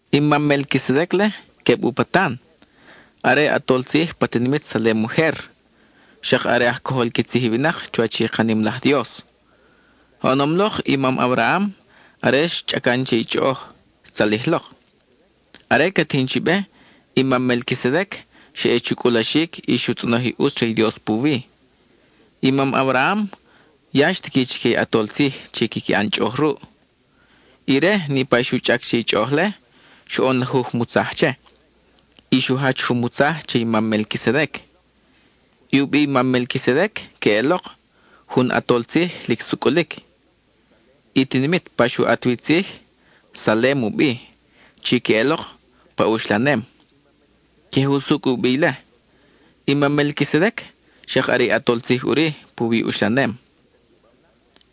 I mam Melquisedec-le, queb u patan. Are ʼatol tzij pa tinimit Salem ujer, xak are aj cojol qui tzij i winak chuwach i ka nim laj Dios. Oʼonom lok i mam Abraham, are xchʼacan che i chʼoʼoj, xtzalij lok. Are ca tijin chi be, i mam Melquisedec xa ʼe chu cʼulaxic y xu tzʼonoj i ʼutz re i Dios puwi. I mam Abraham ya xtiqui chique i ʼatol tzij chi quiqui ʼan chʼoʼoj ruʼ. Ire niʼpa i xu chʼac che i chʼoʼoj-le, xoʼon lajuj mutzaj che, y xu jach jun mutzaj che i mam Melquisedec. I u bi i mam Melquisedec queʼelok: “Jun ʼatol tzij lic sucʼulic.” I tinimit pa xu ʼat wi i tzij, Salem u bi, chi queʼelok: “Pa uxlanem.” Queje usucʼ u bi ile. I mam Melquisedec xak are i ʼatol tzij ʼuri puwi i uxlanem.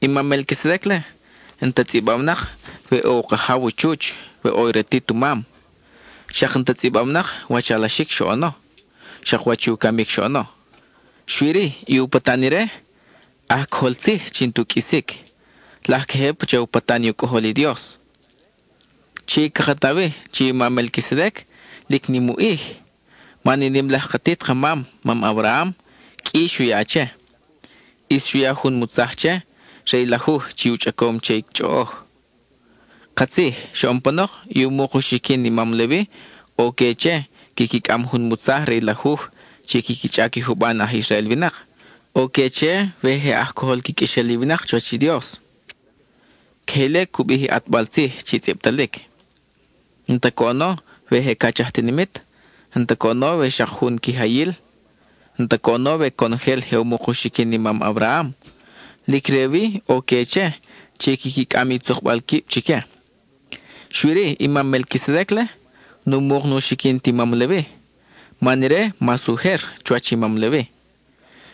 I mam Melquisedec-le, n-ta tzʼibawnak we ʼo u kajaw u chuch, we ʼo ratit u mam; xak n-ta tzʼibawnak wach alaxic xoʼono, xak wach i u camic xoʼono. Xui-ri, i u patan ire aj cojol tzij chi n-tu qʼuisic, laj queje pacha u patan i u Cʼojol i Dios. Chi caka ta wi chi i mam Melquisedec lic nim u ʼij, man i nim laj katit ka mam, mam Abraham, qʼui xu ya che. ʼIs xu ya jun mutzaj che re i lajuj chi u chʼacom che i chʼoʼoj. Katzij, xoʼon panok i u muk u xiquin i mam Levi ʼo que che quiqui cʼam jun mutzaj re i lajuj chi quiqui chʼac i juban aj Israel winak. ʼO que che we je aj cojol qui qʼuexel i winak chuwach i Dios. Queje ile cu bij i ʼatbal tzij chi tzʼibtalic. N-ta coʼono we je cach aj tinimit, n-ta coʼono we xak jun quijayil, n-ta coʼono we conojel je u muk u xiquin i mam Abraham, lic re wi ʼo que che chi quiqui cʼam i tzukbal quib chique. Xui-ri, i mam Melquisedec-le, nu muk nu xiquin ti mam Levi, man ire mas ujer chuwach i mam Levi.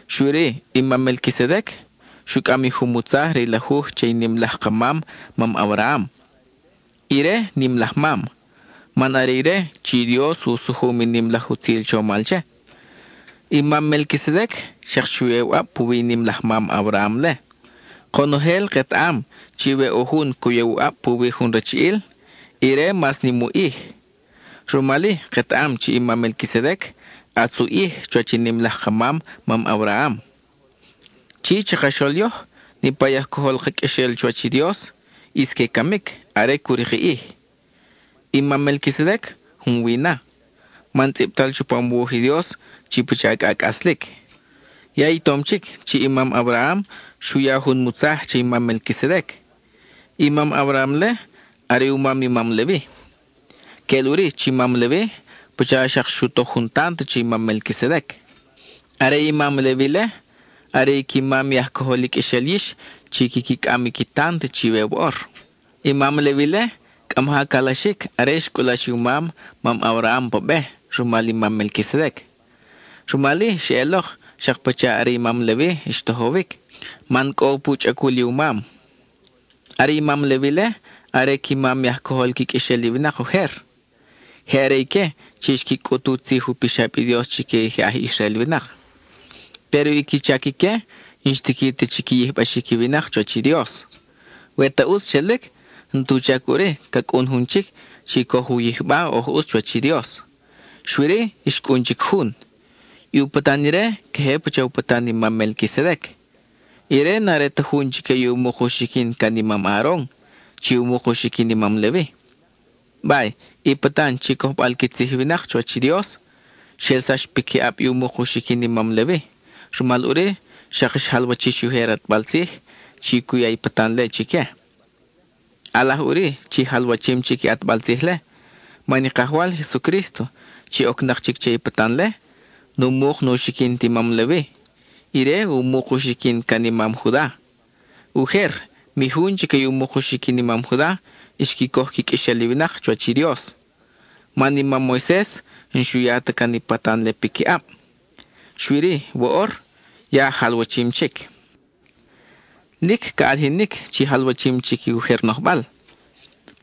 Xui-ri i mam Melquisedec xu cʼam i jun mutzaj re i lajuj che i nim laj ka mam, mam Abraham. Ire nim laj mam, man are ire chi i Dios u sujum i nim laj utzil chomal che. I mam Melquisedec xak xu ya u ʼab puwi i nim laj mam Abraham-le. Konojel ketaʼam chi we ʼo jun cu ya u ʼab puwi jun rachiʼil, ire mas nim u ʼij. (Rumal-i, ketaʼam chi i mam Melquisedec, ʼatz u ʼij chuwach i nim laj ka mam, mam Abraham.) Chi, chakaxol yoj, niʼpa i aj cojol ka qʼuexel chuwach i Dios ʼis que camic are cu rik i ʼij. I mam Melquisedec, junwi na, man tzʼibtal chupam u wuj i Dios chi pacha cʼa cʼaslic. Ya i tom chic chi i mam Abraham xu ya jun mutzaj che i mam Melquisedec. I mam Abraham-le, are u mam i mam Levi. Queʼel ʼuri chi i mam Levi pacha xak xu toj u tant che i mam Melquisedec. Are i mam Levi-le, are i qui mam i aj cojol i qʼuexel yix chi quiqui cʼam qui tant chiwe woʼor. I mam Levi-le, cʼa maja calaxic are xcʼulax i u mam, mam Abraham, pa be rumal i mam Melquisedec. Rumal-i xeʼelok xak pacha are i mam Levi xtojowic, man cʼo pu chʼacul i u mam. Are i mam Levi-le, are qui mam i aj cojol qui qʼuexel i winak ujer. Je are ique chi xqui cʼut u tzij u pixab i Dios chique i aj Israel winak. Péro i qui chac ique, n-xtiqui ta chi qui yijbaxic i winak chuwach i Dios. We ta ʼutz xelic, n-tu chac ʼuri ca cʼun jun chic chi coj u yijba oj ʼutz chuwach i Dios. Xui-ri, xcʼun chic jun, i u patan ire queje pacha u patan i mam Melquisedec. Ire n-are ti jun chique i u muk u xiquin can i mam Aaron (chi u muk u xiquin i mam Levi). Bay, i patan chi cojbal qui tzij i winak chuwach i Dios, xelsax piquiʼab i u muk u xiquin i mam Levi, rumal ʼuri xak xjalwa-chix i ujer ʼatbal tzij chi cu ya i patan-le chique. ʼAlaj ʼuri chi jalwachim chic i ʼatbal tzij-le, man i Kajwal Jesucrísto chi ocnak chic che i patan-le, nu muk nu xiquin ti mam Levi, ire u muk u xiquin can i mam Juda. Ujer, mi jun chique u muk u xiquin i mam Juda xqui coj qui qʼuexel i winak chuwach i Dios, man i mam Moises n-xu ya ta can i patan-le piquiʼab. Xui-ri, woʼor, ya jalwachim chic. Lic ca ʼalijinic chi jalwachim chic i ujer nojbal,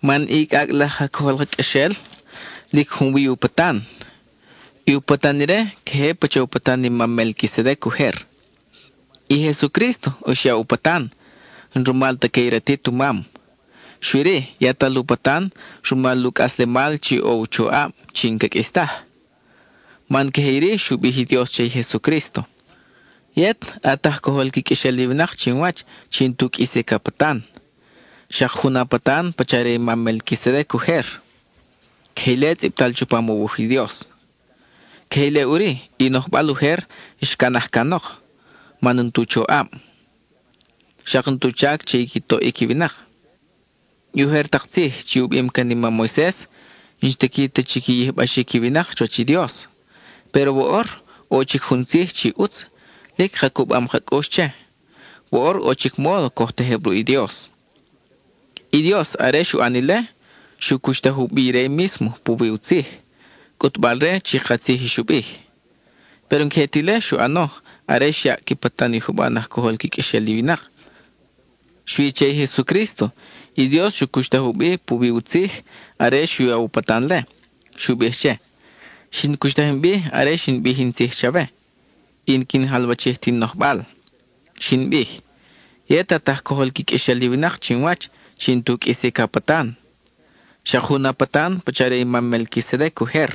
man i cʼacʼ laj aj cojol ka qʼuexel lic junwi u patan. I u patan ire queje pacha u patan i mam Melquisedec ujer. I Jesucrísto, xyaʼ u patan, n-rumal ta que i ratit u mam, xui-ri, yatal u patan rumal u cʼaslemal chi ʼo u choʼab chi n-ca qʼuis taj. Man queje iri xu bij i Dios che i Jesucrísto: Yet at aj cojol qui qʼuexel i winak chinwach chi n-tu qʼuisic a patan. Xak jun a patan pacha re i mam Melquisedec ujer. (Queje ile tzʼibtal chupam u wuj i Dios.) Queje ile ʼuri, i nojbal ujer xcanaj canok, man n-tu choʼab, xak n-tu chac che i qui toʼic i winak. I ujer tak tzij chi u bim can i mam Moises n-xtiqui ta chi qui yijbaxic i winak chuwach i Dios. Péro woʼor, ʼo chic jun tzij chi ʼutz, lic ka cubam ka cʼux che; woʼor ʼo chic módo coj tejeb ruʼ i Dios. I Dios, are xu ʼan ile, xu cuxtaj u bi ire mísmo puwi u tzij, cʼutbal-re chi katzij i xu bij. Péro n-queje ta ile xu ʼano are xyaʼ qui patan i juban aj cojol qui qʼuexel i winak. Xui che i Jesucrísto, i Dios xu cuxtaj u bi puwi u tzij are xu ya u patan-le; xu bij che: Xin cuxtaj in bi are xin bij in tzij chawe, y n-quin jalwachij ta in nojbal. Xin bij: “Yet at aj cojol qui qʼuexel i winak chinwach chi n-tu qʼuisic a patan. Xak jun a patan pacha re i mam Melquisedec ujer.”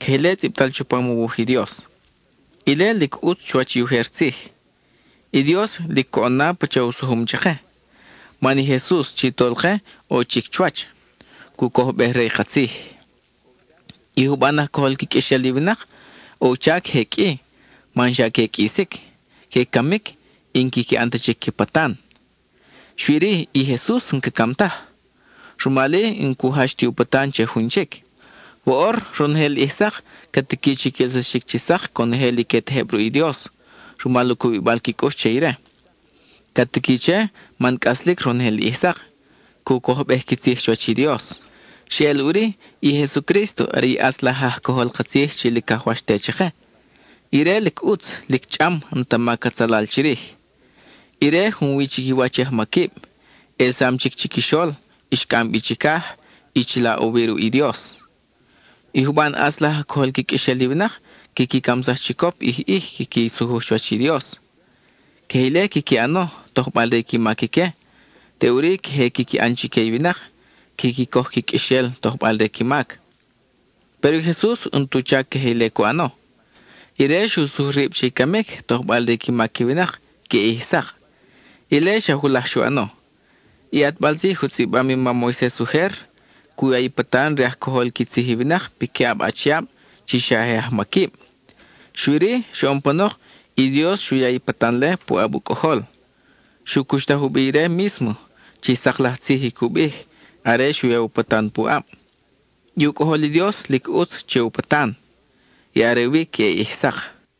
(Queje ile tzʼibtal chupam u wuj i Dios.) Ile lic ʼutz chuwach i ujer tzij. I Dios lic coʼon na pacha u sujum chake, man i Jesus chi Tolke ʼo chic chuwach, cu cojbej re ka tzij. I juban aj cojol qui qʼuexel i winak, ʼo u chac je qʼui, man xa que qʼuisic. Que camic, y n-quiqui ʼan ta chic qui patan. Xui-ri, i Jesus n-ca cam taj, rumal-i n-cu jach ti u patan che jun chic. Woʼor, ronojel ʼij sak, ca tiqui chi quelsaxic chi sak conojel i que tejeb ruʼ i Dios rumal u cubibal qui cʼux che ire. Ca tiqui che man cʼaslic ronojel ʼij sak, cu cojbej qui tzij chuwach i Dios. Xeʼel ʼuri, i Jesucrísto are i ʼatz laj aj cojol ka tzij chi lic cajwax te chake. Ire lic ʼutz, lic chʼam, n-ta mac atzalal chirij. Ire junwi chiquiwach i ajmaquib; ʼelsam chic chiquixol, xcʼam bi chicaj, y chila ʼo wi ruʼ i Dios. I juban ʼatz laj aj cojol qui qʼuexel i winak quiqui camsaj chicop ʼij ʼij quiqui sujuj chuwach i Dios. Queje ile quiqui ʼano tojbal re qui mac ique; teʼuri queje quiqui ʼan chique i winak, quiqui coj qui qʼuexel, tojbal re qui mac. Péro i Jesus n-tu chac queje ile cu ʼano. Ire xu sujuj rib che i camic, tojbal re qui mac i winak queʼe ʼij sak. Ile xa julaj xu ʼano. I ʼatbal tzij u tzʼibam i mam Moises ujer, cu ya i patan re aj cojol qui tzij i winak piquiʼab achiab chi xa je ajmaquib. Xui-ri, xoʼon panok, i Dios xu ya i patan-le puʼab u Cʼojol. Xu cuxtaj u bi ire mísmo, chi sak laj tzij i cu bij are xu ya u patan puʼab. I u Cʼojol i Dios lic ʼutz che u patan, y are wi queʼe ʼij sak.